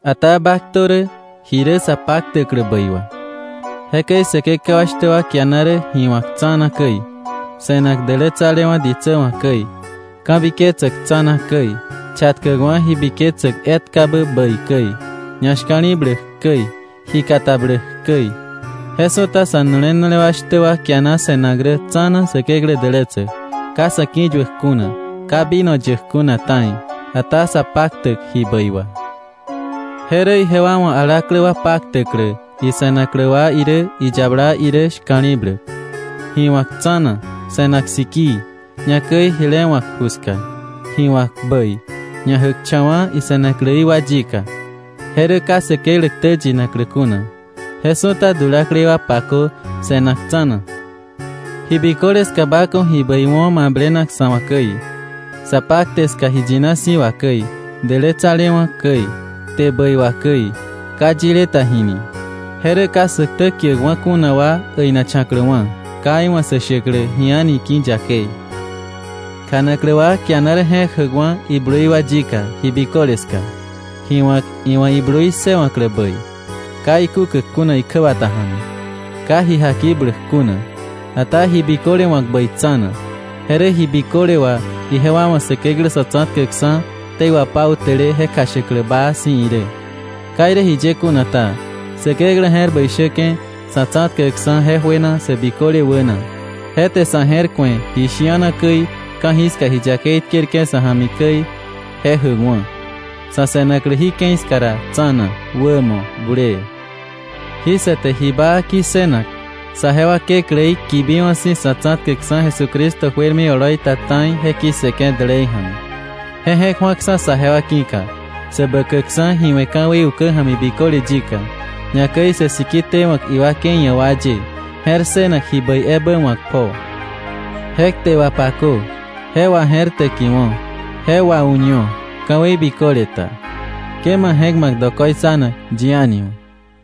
Ata ba ktö rä ji rä sa paktäklä bäi wà. Jekäi säkekewa shtä wa kiana rä ji wa̱k tsa̱na käi, se̱nak dälätsalewa̱ ditsä wa̱ käi, ka̱biketsäk tsa̱na käi, chatkäkwa̱ ji biketsäk etkabä bäi käi, ñashka̱li̱bläk käi, ji katabläk käi. Je su̱ta sa̱nu̱le nu̱le wa shtä wa kiana se̱nak rä tsa̱na Säkeklä dälätsäk, ka sa̱ ki̱yuäk kuna, ka vino yäk kuna ta̱i, ata sa paktäk ji bäi wà. Je rä ijewa wa̱ alaklä wa paktäklä ise̱naklä wa irä iyabala irä shka̱li̱bläk, ji wa̱k tsa̱na, se̱nak sikii, ñakäi jile wa̱k ju ska, ji wa̱k bäi, ñajäkcha̱wa̱ ise̱nakläí wa yika. Je rä ka Säkeklä ktä yinaklä kuna. Je su̱ta dulaklei wa pakö se̱nak tsa̱na. Ji biköle ska ba ku̱ ji bäi wo̱ mablenak sa̱ wa̱ käi, sa pakte ska ji yina si̱ wà käi, dälätsalewa̱ käi, kte bäi wà käi, ka yile ta jini. Je rä ka sä ktä kiäkwa̱ kuna wa äinacha̱kläwa̱, ka iwa̱ sä shäklä ji a̱ni ki̱ yakei. Kjanaklä wa kiana rä je̱k jäkwa̱ iblui wa yika ji biköle ska, ji wa̱k iwa̱ iblui ssëwa̱klä bäi, ka ikúkäk kuna ikjäbata ja̱mi, ka ji jakibläk kuna, ata ji biköle wa̱k bäi tsa̱na. Je rä ji biköle wà ijewa wa̱ Säkeklä Sa̱tsa̱tkäkksa̱ ktei wapautäle je kjashäklä baa si̱ irä. Ka irä jiye kuna ta, Säkeklä je̱r bäi shäke̱ sa̱ tsa̱tkäkksa̱ je juena sä biköle wäna. Je te sa̱ je̱r ku̱e ji shi̱ana käi, ka̱jiska ji yakei tkerke̱ sa̱ ja̱mi käi je jäkwa̱, sa̱ se̱naklä jí ke̱i ska ra tsa̱na, wämo, bulee, jí sa te ji baa ki̱ssënak, saje wa Kekläí kibiwa̱ si̱ Sa̱tsa̱tkäkksa̱ Jesucristo juermi oloi ta ta̱i je ki̱ssëke̱ dälei ja̱mi. Je je̱k ju̱aksa̱ saje wa ki̱ka, sä bäkäkksa̱ ji we̱ ka̱wei ukä ja̱mi biköle yika, ñakäi sä siki tewa̱k iwakei ia̱ wa ye, je̱r ssënak ji bäi ebä wa̱k pjoo. Je kte wapakö, je waje̱rtäkiwo̱, je wau̱ño ka̱wei biköle ta. Ke ma je̱k ma̱k dokoitsanak yi a̱ni wa̱.